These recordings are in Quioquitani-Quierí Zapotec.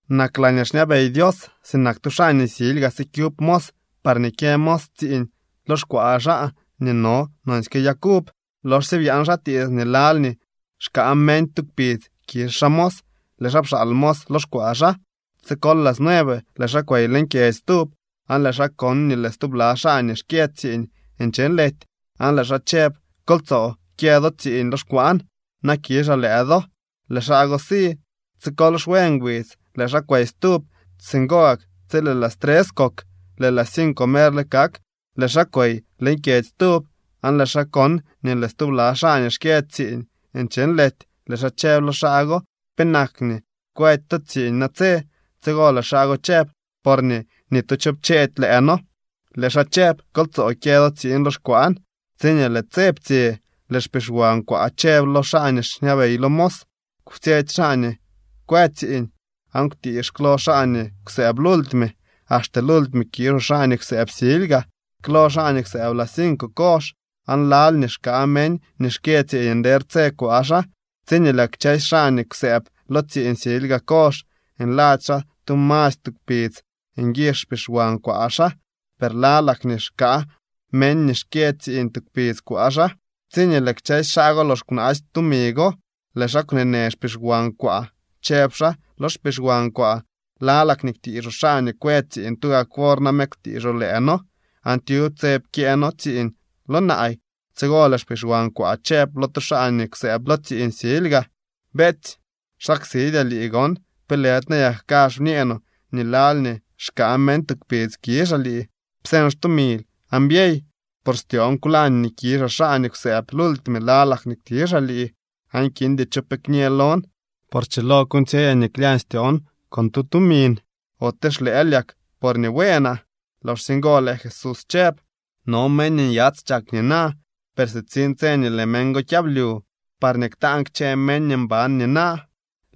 ’Nak laañee xñabey Dios sinak tu xaa nii silyga sikyub mos parñee kyë mos tsiiñ lo xkwaa xaa nii no nonsyke yag uv. Loxsye byaan xaa tiits nii lal nii xkaa meñ tu kpidz kizh xaa mos, lëë xaa pxaal mos lo xkwaa xaa. Tsi kol las nueve lëë xaa kwey leñ kyedzy stub, aan lëë xaa kon nii lëë stubla xaa nii xkyë tsiiñ nche nlety. Aan lëë xaa chëb: “Kol tsoo kyë do tsiiñ lo xkwaan, na kizhaa lëë do.” Lëë xaa go si. Tsi kol xwe ngbidz lëë xaa kwey stub, singo gak tsi lëë las tres kok. Lëë las cinco merle kak tsiñee lëë xaa kwey leñ kyedzy stub, aan lëë xaa kon nii lëë stubla xaa nii xkyë tsiiñ nche nlety. Lëë xaa chëb lo xaa go: “¿Penak nii kwëdy to tsiiñ natse?” Tsigo lëë xaa go chëb: “Porñee ni tu cho pcheedy lëë noo.” Lëë xaa chëb: “Kol tsoo kyë do tsiiñ lo xkwaan.” Tsiñee lëë tse ptsye, lëë xpixwan kwaa chëb lo xaa nii xñabey lo mos: “Kwtsyetsy xaa nii kwë tsiiñ, aan kwtiix klo xaa nii kwsëëb lultime. Axte lultime kizhoo xaa nii kwsëëb silyga.” Klo xaa nii kwsëëb las cinco kozh aan lal nii xkaa meñ nii xkyë tsiiñ nder tse kwaa xaa. Tsiñee lëë kchësy xaa nii kwsëëb lo tsiiñ silyga kozh nladzy xaa tu masy tu kpidz nguizh xpixwan kwaa xaa, per lalak nii xkaa meñ nii xkyë tsiiñ tu kpidz kwaa xaa. Tsiñee lëë kchësy xaa go lox kwnaasy tumi go, lëë xaa kwneenë xpixwan kwaa, chëb xaa lo xpixwan kwaa: “Lalak nii kwtiizhoo xaa nii kwë tsiiñ tugak wor name kwtiizhoo lëë noo, aan tyub tse pkyëë noo tsiiñ lo naay.” Tsigo lëë xpixwan kwaa chëb lo tu xaa nii kwsëëb lo tsiiñ silyga: “Beetsy, xsaksidyaa lii gon. ¿Pe lëdy nayak kazh bñee no nii lal nii xkaa meñ tu kpidz kizhaa lii? Pseñ xtumil aan byey, por styoon kwlañ nii kizhaa xaa nii kwsëëb lultime lalak nii kwtizhaa lii aan kindy cho pe kñë lon. Por schilo kuuñtsyeyaa nii klyañ styoon con tu tumin. ¿Ote xlëël yak porñee bueenaa?” Loxsye ngo lëë Jesús chëb: —No meñ nii nyats chak nina, per sitsiñ tse nii lëë meñ go kyablyu parñee ktaan kchë meñ nii mban nina.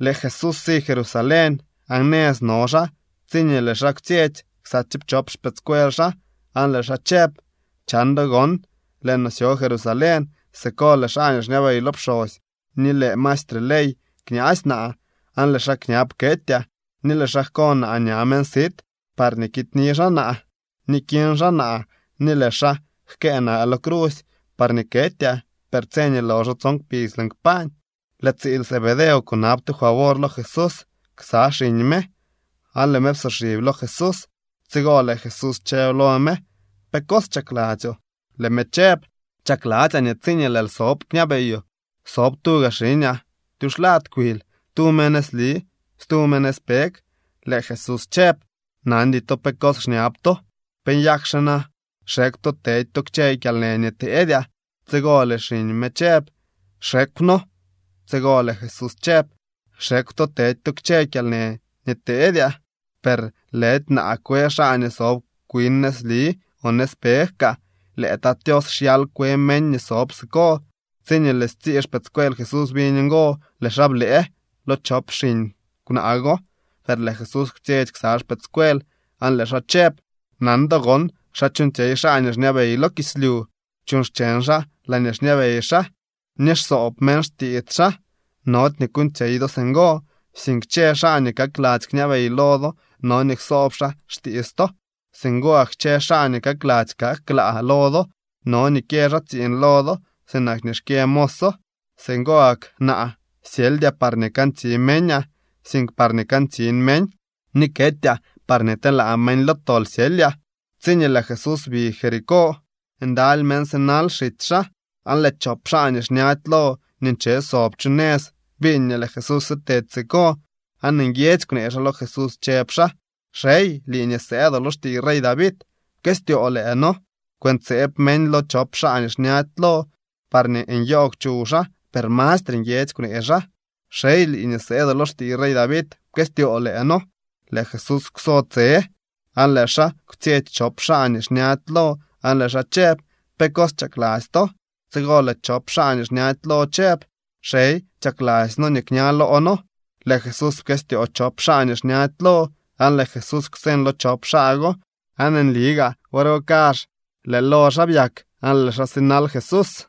Lëë Jesús si Jerusalén, aan nëz no xaa tsiñee lëë xaa kwtsyetsy ksa tsiipchop xpëëdscuel xaa, aan lëë xaa chëb: —Chan do gon, lëë no syo Jerusalén. Siko lëë xaa nii xñabey lo pxosy ni lëë maestre ley kñaasy naa, aan lëë xaa kñab ketyaa, ni lëë xaa jko naa ña meñ sit parñee kidyni xaa naa, ni kiñ xaa naa ni lëë xaa jkëë naa lo crusy parñee ketyaa, per tse nii loxo tson kpidz lëën kpañ. Lëë tsiil Zebedeo kunab tu favor lo Jesús ksa xiñ me, aan lëë me psoxib lo Jesús. Tsigo lëë Jesús chëb lo me: —¿Pe cos chakladzyoo? Lëë me chëb: —Chakladzyaa nii tsiñee lëël sob kñabeyoo sob tuga xiñaa tyuxlad kwil, tu me nëzli stu me nëzpeg. Lëë Jesús chëb: —Nandy to pe cos xñab to. ¿Pe nyakxe na xekw to tedy to kchë kyalnë nii teedyaa? Tsigo lëë xiñ me chëb: —Xekw noo. Tsigo lëë Jesús chëb: —Xekw to tedy to kchë kyalnë nii teedyaa. Per lëdy naa kwe xaa nii sob kwin nëzli o nëzpeg kaa. Lëë Tat Tios xyal kwe meñ nii sob siko. Tsiñee lëë stsii xpëëdscuel Jesús biñ ngo, lëë xaa blëë lo chop xiñ kwnaa go. Per lëë Jesús kwtsyetsy ksa xpëëdscuel aan lëë xaa chëb: —Nan do gon xa chuuñtsyey xaa nii xñabey lo kislyu. Chuuñ xcheñ xaa laañee xñabey xaa, ni xsoob meñ xtiits xaa. Nody nii kuuñtsyey do singo, sink kchë xaa nii kakladzy kñabey lo do no nii ksoob xaa xtiits to. Singo gak kchë xaa nii kakladzy kak klaa lo do no nii kyë xaa tsiiñ lo do sinak nii xkyë moso. Singo gak naa syeldyaa parñee kantsi meñaa, sink parñee kantsin meñ, ni ketyaa parñee telaa meñ lo tol syelyaa. Tsiñee lëë Jesús bi Jericó, ndaly meñ sinal xitsy xaa. Aan lëë chop xaa nii xñady lo nii nche sob chu nëz biñ nii lëë Jesús sitedy siko, aan nguiedzy kwnee xaa lo Jesús chëb xaa: —¡Xey, lii nii sëëdoo lo xtiiy rey David, pkëstyoo lëë noo! Kwëntseeb meñ lo chop xaa nii xñady lo parñee nyoogw chuw xaa, per mastre nguiedzy kwnee xaa: —¡Xey, lii nii sëëdoo lo xtiiy rey David, pkëstyoo lëë noo! Lëë Jesús kwso tse, aan lëë xaa kwtsyetsy chop xaa nii xñady lo aan lëë xaa chëb: —¿Pe cos chakladzy to? Tsigo lëë chop xaa nii xñady lo chëb: —Xey, chakladzy noo nii kña loo noo. Lëë Jesús pkëstyoo chop xaa nii xñady lo aan lëë Jesús kwseñ lo chop xaa go, aan nli gaa wor go kazh lëë lo xaa byak aan lëë xaa sinal Jesús.